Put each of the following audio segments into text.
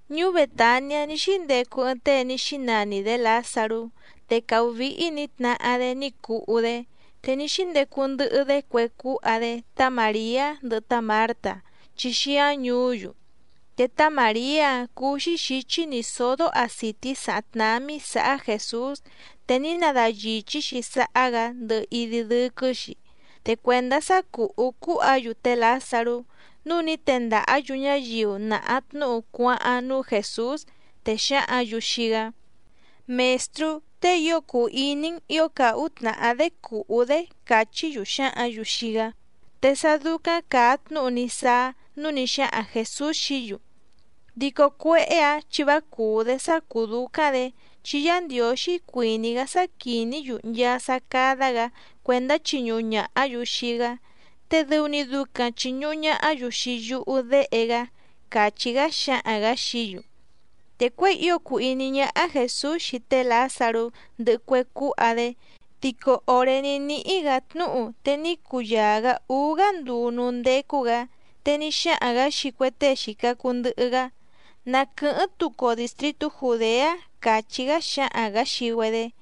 Ñuú Bètaniá ní xíndecu ɨɨⁿ tée ní xínani‑dě Lǎzarú. Te càhú víhí nǐ tnahá‑dé ní cuhú‑dé, te ní xíndecu ndɨhɨ‑dé cue cúha‑dé tá Màriá ndɨhɨ tá Mǎrta chi xíáⁿ ñùú‑yu. Te tá Màriá‑áⁿ cúú‑xí xǐchí nǐ sódó àcití sàháⁿ tnámí sǎhá Jèsús, te ní nadayìchí‑xi sáhá‑gǎ ndɨhɨ idi dɨ́quɨ́‑xi. Te cuèndá sá cùhú cúha‑yu té Lǎzarú, núu ní tendàhá‑yu ñáyiu nàha tnúhu cuáháⁿ núú Jèsús, te xǎhǎⁿ‑yu xii‑gá: —Mèstrú, tée ío cùu iní‑n ǐo càhú tnàhá‑dé cùhú‑dé —càchí‑yu xǎhǎⁿ‑yu xii‑gá. Te sá dúcáⁿ càa tnúhu ní sáá, núu ní xáhaⁿ Jèsús xií‑yu: —Dico cuéhé‑ǎⁿ chi vá cùú‑dé sá cùú dúcáⁿ‑dě, chi Yá Ndiǒxí cuìní‑gá sá quìní‑yu nchaa sá cádá‑gǎ cuèndá chiñuhu ñàhá‑yu xii‑gá, te dɨu‑ni ducaⁿ chìñuhu ñahá‑yu xii yúhú Déhe‑gá —càchí‑gá xáhaⁿ‑gǎ xií‑yu. Te cuěi ío cùu iní ñáhá Jèsús xii té Lǎzarú ndɨhɨ cue cúha‑dé dico òré ní níhí‑gǎ tnúhu, te ní cuyaa‑gǎ úú‑gá nduu núú ndécú‑gǎ. Te ní xáhaⁿ‑gǎ xii cue tée xìca cuu ndɨhɨ‑gá: —Na quɨ̀hɨ́ⁿ tucu‑o dìstritú Jùdeá —càchí‑gá xáhaⁿ‑gǎ xii‑güedé.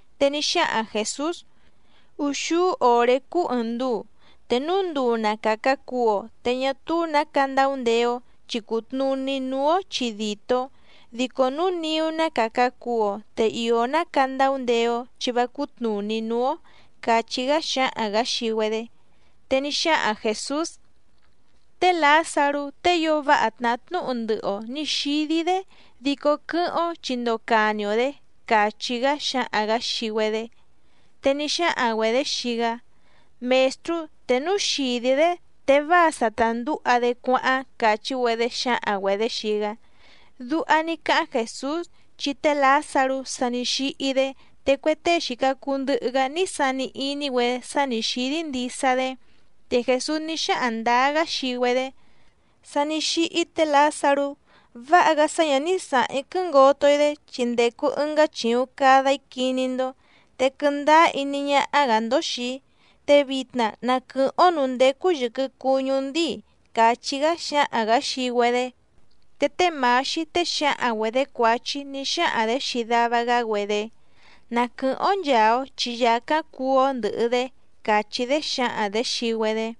Te ní xáhaⁿ Jèsús: —Úxúú òré cúú ɨ̀ɨⁿ nduu, te núu nduu na càca cuu‑o, te ñá túú nǎ candaundeé‑ó chi cùtnuní núú‑ó chi dìtó. Dico núu niú ná càca cuu‑o, te ìó ná candaundeé‑ó chi vá cútnùní núú‑ó —càchí‑gá xáhaⁿ‑gǎ xii‑güedé. Te ní xáhaⁿ Jèsús: —Té Lǎzarú tée ío váha tnàhá tnúhu ndɨhɨ‑o nǐ xídí‑dé dico quɨ́hɨ́ⁿ‑ó chi ndocani‑o‑dě —càchí‑gá xáhaⁿ‑gǎ xii‑güedé. Te ní xáhaⁿ‑güedě xii‑gá: —Mèstrú, te núu xìdí‑dé te váa sa ta ndǔha‑dé cuáháⁿ —càchí‑güedé xǎhaⁿ‑güedě xii‑gá. Duha ní cáháⁿ Jèsús, chi té Lǎzarú sa ní xíhí‑dé te cue tée xìca cuu ndɨhɨ‑gá ní sani iní‑güedé sá nǐ xídí ndisa‑dé. Te Jèsús ní xáhaⁿ ndǎá‑gá xii‑güedé: —Sa ní xíhí té Lǎzarú. Váha‑gá sá ñǎ ní sǎháⁿ‑í quɨ́ngoto‑í‑dé, chi ndècu ɨngá chìuⁿ cada‑í quiní‑ndó, te quɨndáá iní ñáhá‑gǎ‑ndó xìi‑í, te vitna na quɨ̀hɨ́ⁿ‑ó nǔú ndécú yɨ̀quɨ cuñú ndíi —càchí‑gá xáhaⁿ‑gǎ xii‑güedé. Te té Mǎxí tée xǎhaⁿ‑güedě cuǎchí ní xáhaⁿ‑dě xii dava‑gá‑güedé: —Na quɨ̀hɨ́ⁿ‑ó nchàa‑o chi yàcáⁿ cuú‑ó ndɨ̀hɨ‑dé —càchí‑dé xǎhaⁿ‑dě xii‑güedé.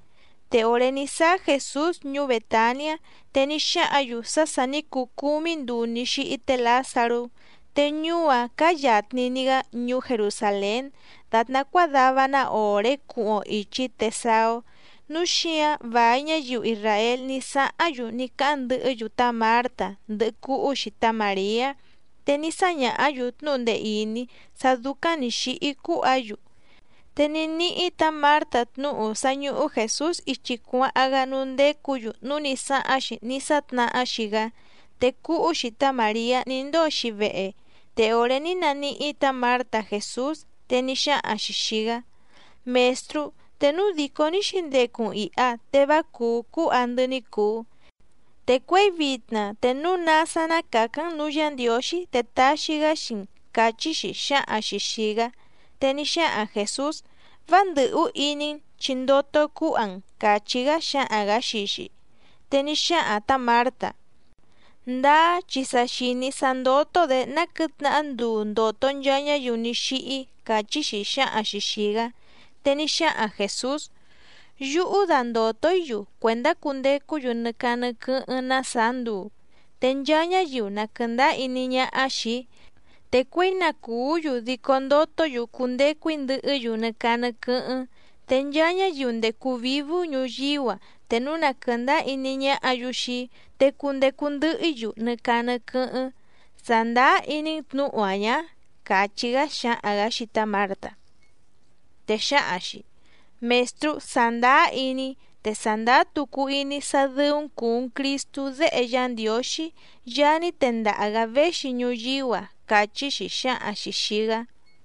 Te òré ní sáá Jèsús ñuú Bètaniá, te ní xáhǎⁿ‑yu sá sà ní cuu cúmí nduu ní xíhí té Lǎzarú. Te ñuú‑áⁿ cáá yàtni‑ni‑gá ñuú Jerusàlén, dàtná cuádava‑ná òré cuhuⁿ‑o ìchi te saá‑ó. Núu xíǎⁿ vài ñáyiu isràél ní sáháⁿ‑yu ní cáháⁿ ndɨhɨ́‑yu tá Mǎrta ndɨhɨ cúhú‑xi tá Màriá, te ní sáñàhá‑yu tnúhu ndee ìní sá dúcáⁿ nǐ xíhí cúha‑yu. Te ní níhí tǎ Mǎrta tnúhu sá ñúhú Jèsús ichi cuáháⁿ‑gá núú ndécǔ‑yu núu ní sáháⁿ‑xi ní sátnahá‑xi‑gá, te cúhú‑xi tá Màriá ní ndóo‑xi vehe. Te òré ní naníhí tǎ Mǎrta Jèsús, te ní xáhaⁿ‑xi xìi‑gá: —Mèstrú, te núu dìcó ní xǐndecu‑n ìha te vá cùú cúha‑ndɨ́ ní cùu. Te cuěi vitna te núu ná sá ná càcáⁿ‑n nǔú Yǎ Ndiǒxí te taxi‑gá xii‑n —càchí‑xi xǎhaⁿ‑xi xìi‑gá. Te ní xáhaⁿ Jèsús: —Vá ndɨ̀hú iní‑n chi ndoto cúha‑n —càchí‑gá xáhaⁿ‑gǎ xii‑xi. Te ní xáhaⁿ tǎ Mǎrta: —Ndáá chi sa xìní‑í sá ndótó‑dě ná quɨ̌tnahá nduu ndòto nchaa ñáyiu ní xíhí —càchí‑xi xǎhaⁿ‑xi xìi‑gá. Te ní xáhaⁿ Jèsús: —Yúhú dandòto‑í‑yu cuèndá cundecú‑yu nɨ caa nɨ quɨ́hɨ́ⁿ ná sàá nduu. Te nchaa ñáyiu na quɨ̀ndáá iní ñáhá xìi‑í, te cuěi na cùú‑yu dico ndotó‑yu cundecu‑í ndɨhɨ́‑yu nɨ caa nɨ quɨ́hɨ́ⁿ. Te nchaa ñáyiu ndècu vívú ñuyíú‑a te núu na quɨ̀ndáá iní ñáhǎ‑yu xii‑í, te cundecu ndɨhɨ‑í‑yu nɨ caa nɨ quɨ́hɨ́ⁿ. ¿Sàndáá iní‑n tnǔhu‑a ñǎ? —càchí‑gá xáhaⁿ‑gǎ xii tá Mǎrta. Te xǎhaⁿ‑xi: —Mèstrú, sàndáá iní‑í, te sàndáá tucu iní‑í sá dɨ́ú‑n cùu‑n Cristú Déhe Yá Ndiǒxí, Yaá ní tendaha‑gǎ véxi ñuyíú‑a —càchí‑xi xǎhaⁿ‑xi xìi‑gá.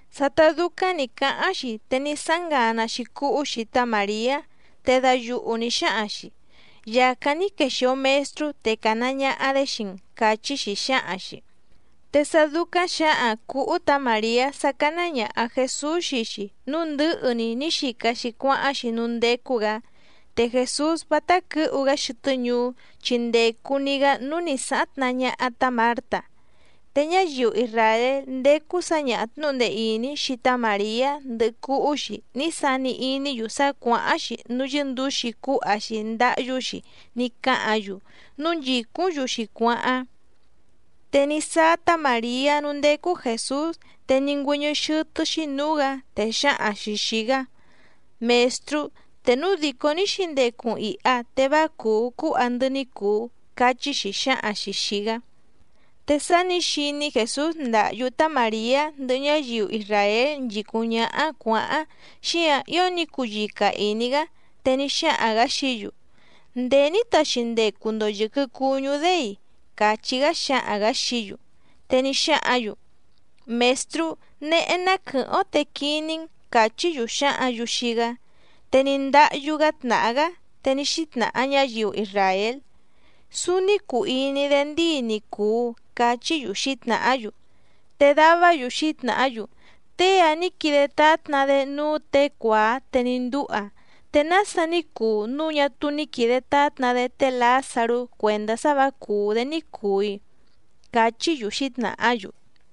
Sátá dúcáⁿ nǐ cáháⁿ‑xi te ní sáháⁿ ngana‑xi cúhú‑xi tá Màriá, te dayuhu nǐ xáhaⁿ‑xi: —Yàcáⁿ ní quexìo Mestrú, te càna ñaha‑dé xii‑n —càchí‑xi xǎhaⁿ‑xi. Te sá dúcáⁿ xǎhaⁿ cǔhú tǎ Màriá sá cáná ñàha Jesús xii‑xi, núu ndɨ̌hɨ‑ni ní xica‑xi cuáháⁿ‑xi núú ndécú‑gǎ. Te Jèsús vátá quɨ̌hu‑gá xɨtɨ́ ñuú, chi ndècu‑ni‑gá núú nǐ sáháⁿ tnahá ñáhá tǎ Mǎrta. Te ñáyiu isràél ndécú sǎñaha tnǔhu ndee ìní xii tá Màriá ndɨhɨ cúhú‑xi ní sani iní‑yu sá cuàháⁿ‑xi núú yɨ́ndǔxi cúha‑xi ndáhyú‑xi ní cáhǎⁿ‑yu, núu nchìcúⁿ‑yu‑xi cuáháⁿ. Te ní sáá tá Màriá núú ndécú Jèsús te ní ngüɨ́ñɨ́ xɨ́tɨ́‑xí nǔú‑gǎ, te xǎhaⁿ‑xi xìi‑gá: —Mèstrú, te núu dìcó ní xǐndecu‑n ìha te vá cùú cúha‑ndɨ́ ní cùu —cachí‑xi xǎhaⁿ‑xi xìi‑gá. Te sá nǐ xiní Jèsús ndàhyú tá Màriá ndɨhɨ ñáyiu isràél nchìcúⁿ ñáhá cuǎháⁿ, xíǎⁿ ío ní cuyica ìní‑gá. Te ní xáhaⁿ‑gǎ xií‑yu: —¿Ndèé ní taxi ndecu‑ndo yɨ̀quɨ cuñú‑dé‑i? —càchí‑gá xáhaⁿ‑gǎ xií‑yu. Te ní xáhǎⁿ‑yu: —Mèstrú, néhé ná quɨ̀hɨ́ⁿ‑ó te quiní‑n —càchí‑yu xǎhǎⁿ‑yu xii‑gá. Te ní ndáhyú‑gá tnàhá‑gá. Te ní xítnàha ñáyiu isràél: —Súúní cùu iní‑dé ndíi ni cùu —cachí‑yu xǐtnàhá‑yu. Te davá‑yu xǐtnàhá‑yu: —Tée‑a ní quide tátna‑dé núú těe cuàá te ní ndúha. ¿Te nása ní cuu núu ñá túú ní quìde tátna‑dé té Lǎzarú cuèndá sá vǎ cùú‑dé ní cùu‑i? —cachí‑yu xǐtnàhá‑yu.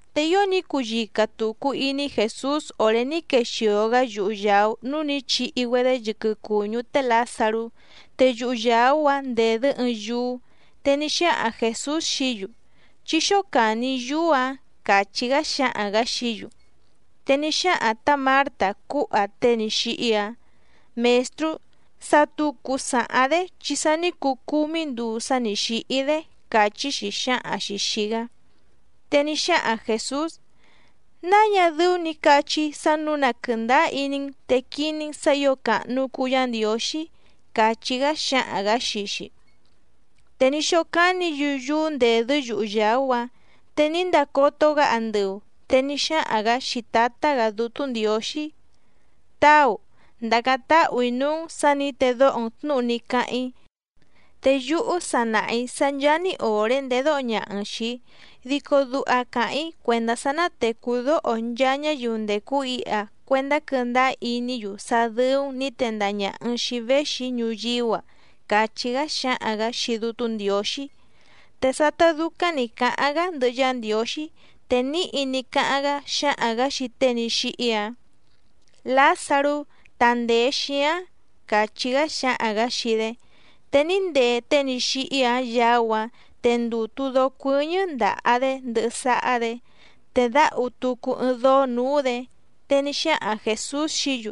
Te ío ní cuyica tùcu iní Jèsús òré ní quexìo‑gá yuhu yàú núú nǐ chihi‑güedé yɨquɨ cùñú té Lǎzarú. Te yuhu yàú‑áⁿ ndèdɨ́ ɨɨⁿ yúú. Te ní xáhaⁿ Jèsús xií‑yu: —Chí xócàni yúú‑ǎⁿ —càchí‑gá xáhaⁿ‑gǎ xií‑yu. Te ní xáhaⁿ tǎ Mǎrta cúha tée ní xíhí‑áⁿ: —Mèstrú, sa tucu sàháⁿ‑dé chi sa ní cuu cúmí nduu sá nǐ xíhí‑dé —càchí‑xi xǎhaⁿ‑xi xìi‑gá. Te ní xáhaⁿ Jèsús: —¿Náa ñá dɨ́ú nǐ cachí‑í sá nǔu na quɨ̀ndáá iní‑n, te quiní‑n sǎ ǐo càhnu cuu Yá Ndiǒxí? —càchí‑gá xáhaⁿ‑gǎ xii‑xi. Te ní xócánǐ‑yu yúú ndèdɨ́ yuhu yàú‑áⁿ. Te ní ndacoto‑gá andɨu, te ní xáhaⁿ‑gǎ xii Tǎtá‑gǎ Dútú Ndiǒxí: —Táu, ndàcáⁿ táhù‑í núú‑n sǎ nǐ tèdoho‑n tnúhu ní cáháⁿ‑í. Te yúhú sa nàha‑í sá ncháá‑ni òré ndèdóho ñaha‑n xìi‑í, dico duha càháⁿ‑í cuèndá sá ná tècú dóho nchaa ñáyiu ndècu iha cuendá quɨ́ndáá iní‑yu sá dɨ́ú‑n nǐ tendaha ñàha‑n xii‑í véxi‑í ñuyíú‑a —càchí‑gá xáhaⁿ‑gǎ xii Dútú Ndiǒxí. Te sátá dúcáⁿ nǐ cáháⁿ‑gá ndɨhɨ Yá Ndiǒxí, te níhi ní cáháⁿ‑gá xáhaⁿ‑gǎ xii tée ní xíhí‑áⁿ: —¡Lǎzarú, tandèe xíáⁿ! —càchí‑gá xáhaⁿ‑gǎ xii‑dé. Te ní ndee tée ní xíhí‑áⁿ yaú‑áⁿ, te ndùtu dóó cuɨ́ñɨ́ ndàha‑dé ndɨhɨ sáhá‑dě, te dǎhu tucu ɨɨⁿ dóó nǔú‑dě. Te ní xáhaⁿ Jèsús xií‑yu: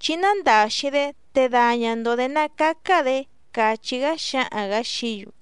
—Chí nándàxi‑dé te daña‑ndo‑dě ná cácá‑dě —càchí‑gá xáhaⁿ‑gǎ xií‑yu.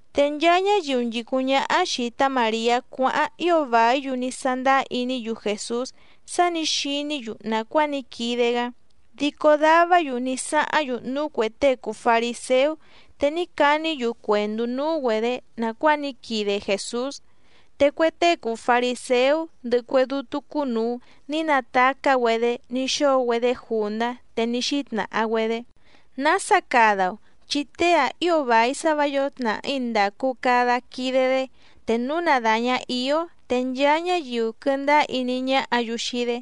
Te nchaa ñáyiu nchìcúⁿ ñáhá xìi tá Màriá cuáháⁿ ío vàí‑yu ní sándáá iní‑yu Jèsús sá nǐ xiní‑yu nàcuáa ní quide‑gá. Dico davá‑yu ní sáháⁿ‑yu núú cuè tée cùu fariséú, te ní caní‑yu cuèndú núú‑güedě nàcuáa ní quide Jèsús. Te cue tée cùu fariséú ndɨhɨ cue dútú cúnùu ní natacá‑güedé ní xóo‑güedé jùndá, te ní xítnàha‑güedé: —¿Nása cada‑o?, chi tée‑ǎⁿ ío vài sá vǎ yǒo tnàhí ndàcu cada quide‑dé. Te núu na dàña íó te nchaa ñáyiu quɨndáá iní ñáhǎ‑yu xii‑dé,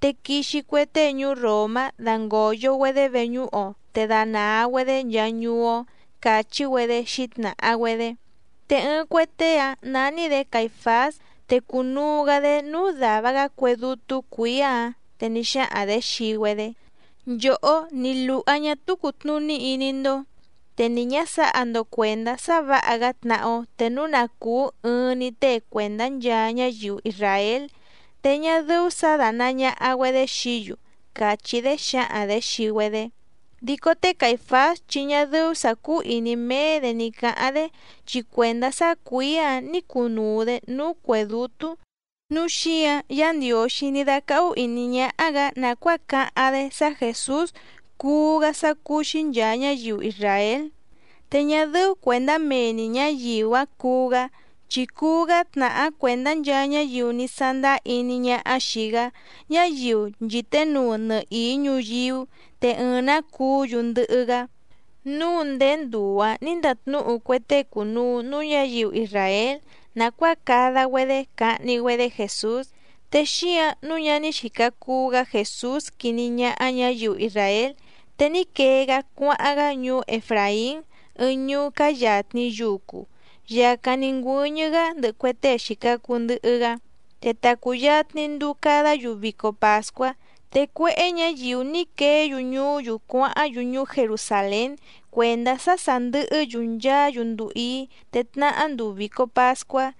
te quixi cue tée ñuú Ròmá dangòyo‑güedé veñúhu‑o te danàa‑güedé nchaa ñuú‑ó —càchí‑güedé xǐtnàha‑güedé. Te ɨɨⁿ cue tée‑áⁿ nání‑dě Caìfás, te cùnuu‑gá‑dé núú dàva‑gá cue dútú cuǐá‑ǎⁿ, te ní xáhaⁿ‑dě xii‑güedé: —Nchòhó ni lùha ñá túú cùtnuní iní‑ndó. Te ni ñǎ sǎha‑ndo cuèndá sá vǎha‑gá tnahá‑ó, te núu na cùú ɨɨⁿ‑ni tée cuèndá nchaa ñáyiu isràél, te ñá dɨ́ú sǎ dánàa ñaha‑güedé xií‑yu —càchí‑dé xǎhaⁿ‑dě xii‑güedé. Dico té Caìfás chi ñá dɨ́ú sǎ cúú ìní méé‑dě ní cǎháⁿ‑dé, chi cuèndá sá cuǐá‑ǎⁿ nǐ cunuu‑dě núú cuè dútú, núu xíǎⁿ Yǎ Ndiǒxí ní dácáhú ìní ñáhá‑gǎ nàcuáa cáháⁿ‑dé sá Jèsús cuú‑gá sá cúú‑xí nchàa ñáyiu isràél. Te ñá dɨ́ú cuèndá mee‑ni ñǎyiu‑áⁿ cuú‑gá, chi cuú‑gá tnàhá cuèndá nchaa ñáyiu ní sándáá iní ñáhá xìi‑gá, ñáyiu nchìténuu nɨhìí ñuyíú, te ɨɨⁿ‑nǎ cuú‑yu ndɨhɨ‑gá. Núu ndéé nduu‑ǎⁿ nǐ ndatnúhu cue tée cùnuu núú ñǎyiu isràél nàcuáa cada‑güedé cahni‑güedé Jèsús. Te xíǎⁿ nǔu ñá ní xìca cuu‑gá Jèsús quiní ñáhá ñǎyiu isràél, te ní quee‑gá cuáháⁿ‑gá ñuú Efràín, ɨɨⁿ ñuú cáá yàtni yucu, yàcáⁿ ní ngüɨ́ñɨ́‑gá ndɨhɨ cue tée xìca cuu ndɨhɨ‑gá. Te ta cùyatni nduu cadá‑yu vico pàscuá. Te cuéhé ñǎyiu ní queé‑yu ñuú‑yu cuáháⁿ‑yu ñuú Jerusàlén cuèndá sá sà ndɨhɨ́‑yu nchaá‑yu nduu íí, te tnahá nduu vìco pascuá.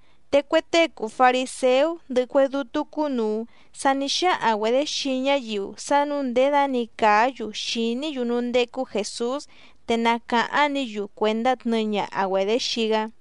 Te cue tée cùu fariséú ndɨhɨ cue dútú cúnùu sa ní xáhaⁿ‑güedě xii ñáyiu sá nǔu nděda‑ni càá‑yu xìní‑yu núú ndécú Jèsús te na càháⁿ‑ni‑yu cuèndá tnɨɨ ñaha‑güedě xii‑gá.